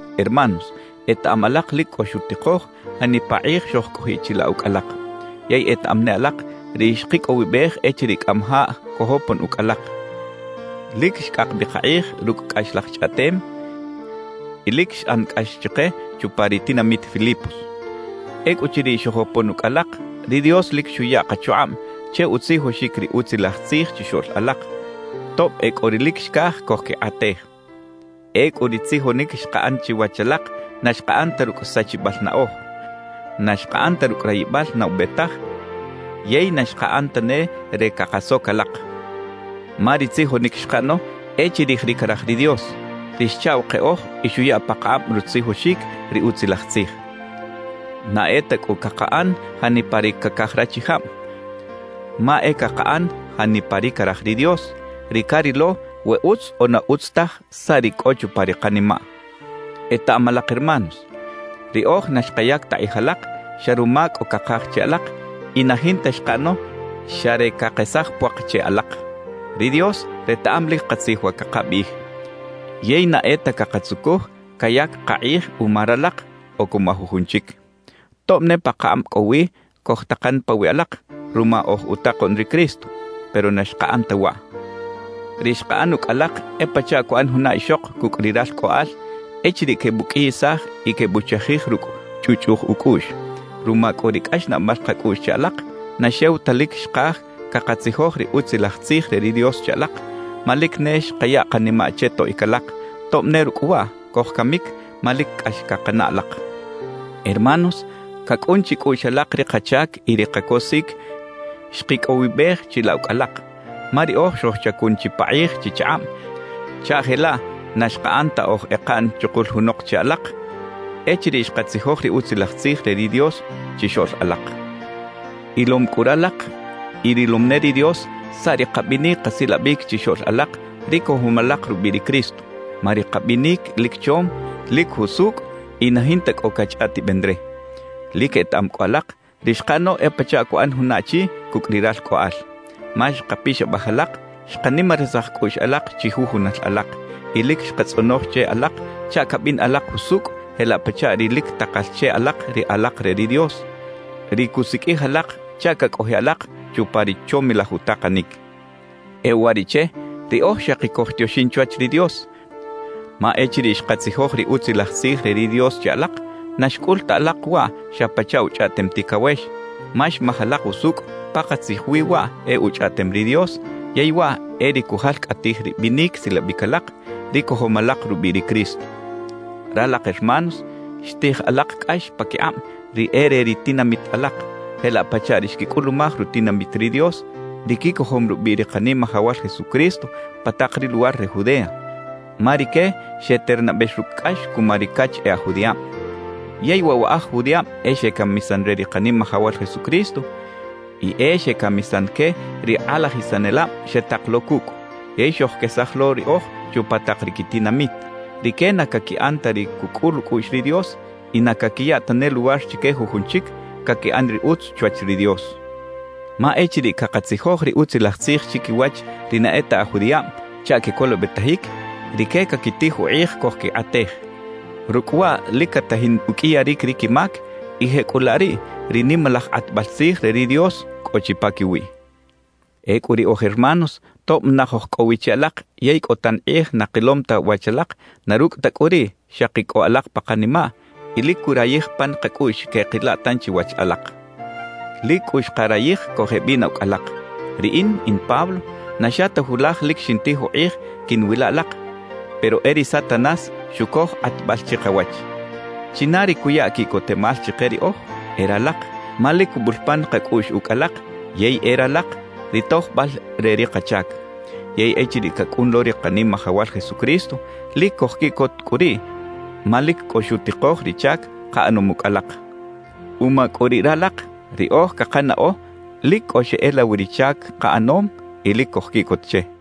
Hermanos, etaꞌam alak lic cꞌo xutikoj janipa kꞌij xojcꞌojiꞌ chilaꞌ ucꞌ alak. Yey etaꞌam ne alak ri xkicꞌowibej echiriꞌ cꞌamajaꞌ cojopon ucꞌ alak; lic xcꞌak bi kakꞌij rucꞌ cꞌaxlaj chꞌaꞌtem y lic xꞌan cꞌax chike chupa ri tinamit Filipos. Ecꞌuchiriꞌ xojopon ucꞌ alak, ri Dios lic xuya kachukꞌab che utzijoxic ri Utzilaj Tzij chixoꞌl alak, tob e cꞌo ri lic xcaj cojquikꞌatej. Ecꞌu ri tzijonic xkaꞌan chiwach alak na xkaꞌan ta rucꞌ sachibal naꞌoj, na xkaꞌan ta rucꞌ rayibal na ube taj yey na xkaꞌan tane re cakasoc alak. Ma ri tzijonic xkaꞌano e chirij ri caraj ri Dios, ri xchaꞌw keꞌoj y xuya pakakꞌab rutzijoxic ri Utzilaj Tzij. Na e ta cꞌu cakaꞌan janipa ri cacaj rachijab, ma e cakaꞌan janipa ri caraj ri Dios, ri carilo we utz o na utz taj saꞌ ri cꞌo chupa ri kanimaꞌ. Etaꞌam alak hermanos, riꞌoj na xkayac ta kꞌij alak xa ruma cꞌo cakaj che alak y na jinta xkaꞌano xa re cakesaj puak che alak. Ri Dios retaꞌam lic katzij wa cakabiꞌij. Yey na e ta cakatzucuj cayac kakꞌij uma ralak o cuma jujun chic. Tob ne pakakꞌab cꞌo wi cojtakan pawiꞌ alak ruma oj utakoꞌn ri Cristo, pero na xkaꞌan ta waꞌ. Ri xkaꞌan ucꞌ alak e pachaꞌ cuꞌan juna ixok cucꞌ ri ralcꞌoꞌal echiriꞌ quebuqꞌuiyisaj y quebuchajij rucꞌ chꞌuꞌchꞌuj ucꞌuꞌx. Ruma cꞌu ri cꞌaxnaꞌbal kacꞌuꞌx che alak, na xew ta lic xkaj cakatzijoj ri Utzilaj Tzij re ri Dios che alak, ma lic ne xkaya kanimaꞌ che toꞌic alak, tob ne rucꞌ waꞌ cojcamic, ma lic cꞌax cakanaꞌ alak. Hermanos, cacꞌun chicꞌuꞌx alak ri kachac y ri kacosic xkicꞌowibej chilaꞌ ucꞌ alak; ma riꞌoj xojchacun chipakꞌij chichakꞌab chaꞌ jelaꞌ na xkaꞌan ta oj ekaꞌn chukul junok che alak echiriꞌ xkatzijoj ri Utzilaj Tzij re ri Dios chixoꞌl alak. Ilom cꞌu ralak y rilom ne ri Dios saꞌ ri kabinic kasilabic chixoꞌl alak ri cojom alak rubiꞌ ri Cristo. Ma ri kabinic lic chom, lic jusucꞌ y na jinta cꞌo cachꞌaꞌtiben re. Lic etaꞌam cꞌu alak, ri xkaꞌano e pachaꞌ cuꞌan juna achi cucꞌ ri ralcꞌoꞌal. Ma xkapixabaj alak, xkanimarisaj cꞌuꞌx alak chijujunal alak y lic xkatzꞌonoj che alak chaꞌ cabin alak jusucꞌ jelaꞌ pachaꞌ ri lic takal che alak ri alak re ri Dios, ri cusiqꞌuij alak chaꞌ cacꞌojiꞌ alak chupa ri chomilaj utakanic. E uwariꞌche, riꞌoj xaki cojtioxin chwach ri Dios, ma echiriꞌ xkatzijoj ri Utzilaj Tzij re ri Dios che alak, na xcꞌul ta alak waꞌ xa pachaꞌ uchꞌaꞌtem ticawex; ma xmaj alak usucꞌ pakatzij wi waꞌ e Uchꞌaꞌtem ri Dios yey waꞌ e ri cujalcꞌatij ri binic silabic alak, ri cojom alak rubiꞌ ri Cristo. Ralak hermanos, xtij alak cꞌax paquikꞌab ri e re ri tinamit alak, jelaꞌ pachaꞌ ri xquicꞌulumaj rutinamit ri Dios, ri quicojom rubiꞌ ri Kanimajawal Jesucristo pa tak ri luwar re Judea, ma rique xeternabex rucꞌ cꞌax cuma ri cach e aj judiꞌab. Yey waꞌ wa aj judiꞌab e xecamisan re ri Kanimajawal Jesucristo y e xecamisan que ri kꞌalajisanelab xetak lo cucꞌ, yey xojquesaj lo riꞌoj chupa tak ri quitinamit. Rique na caquiꞌan ta ri cucꞌul ucꞌuꞌx ri Dios y na caquiya tane luwar chique jujun chic caquiꞌan ri utz chwach ri Dios. Ma echiriꞌ cakatzijoj ri Utzilaj Tzij chiquiwach ri na e ta aj judiꞌab chaꞌ quecolobetajic, rique caquitij ukꞌij cojquikꞌatej. Rucꞌ waꞌ lic catajin uqꞌuiyaric ri quimac y jecꞌulaꞌ riꞌ ri nimalaj kꞌatbal tzij re ri Dios cꞌo chi paquiwiꞌ. Ecꞌu riꞌoj hermanos, tob naj oj cꞌo wi che alak yey cꞌo tan kꞌij na kilom ta wach alak; na rucꞌ ta cꞌu riꞌ xaki cꞌo alak pa kanimaꞌ y lic curayij pan kacꞌuꞌx queꞌkila tanchi wach alak. Lic cꞌu xkarayij cojeꞌbina ucꞌ alak. Riꞌin, in Pablo, na xa ta julaj lic xintij ukꞌij quiꞌnwila alak, pero e ri Satanás xucoj kꞌatbal chikawach. ¿China ri cuya quiꞌcotemal chike riꞌoj? E ralak, ma lic cubul pan kacꞌuꞌx ucꞌ alak yey e ralak ri tojbal re ri kachac. Yey echiriꞌ cacꞌun lo ri Kanimajawal Jesucristo, lic cojquiꞌcot cꞌu riꞌ ma lic cꞌo xutikoj ri chac kaꞌanom ucꞌ alak. Uma cꞌu riꞌ ralak, riꞌoj cakanaꞌo lic cꞌo xeꞌela wi ri chac kaꞌanom y lic cojquiꞌcot che.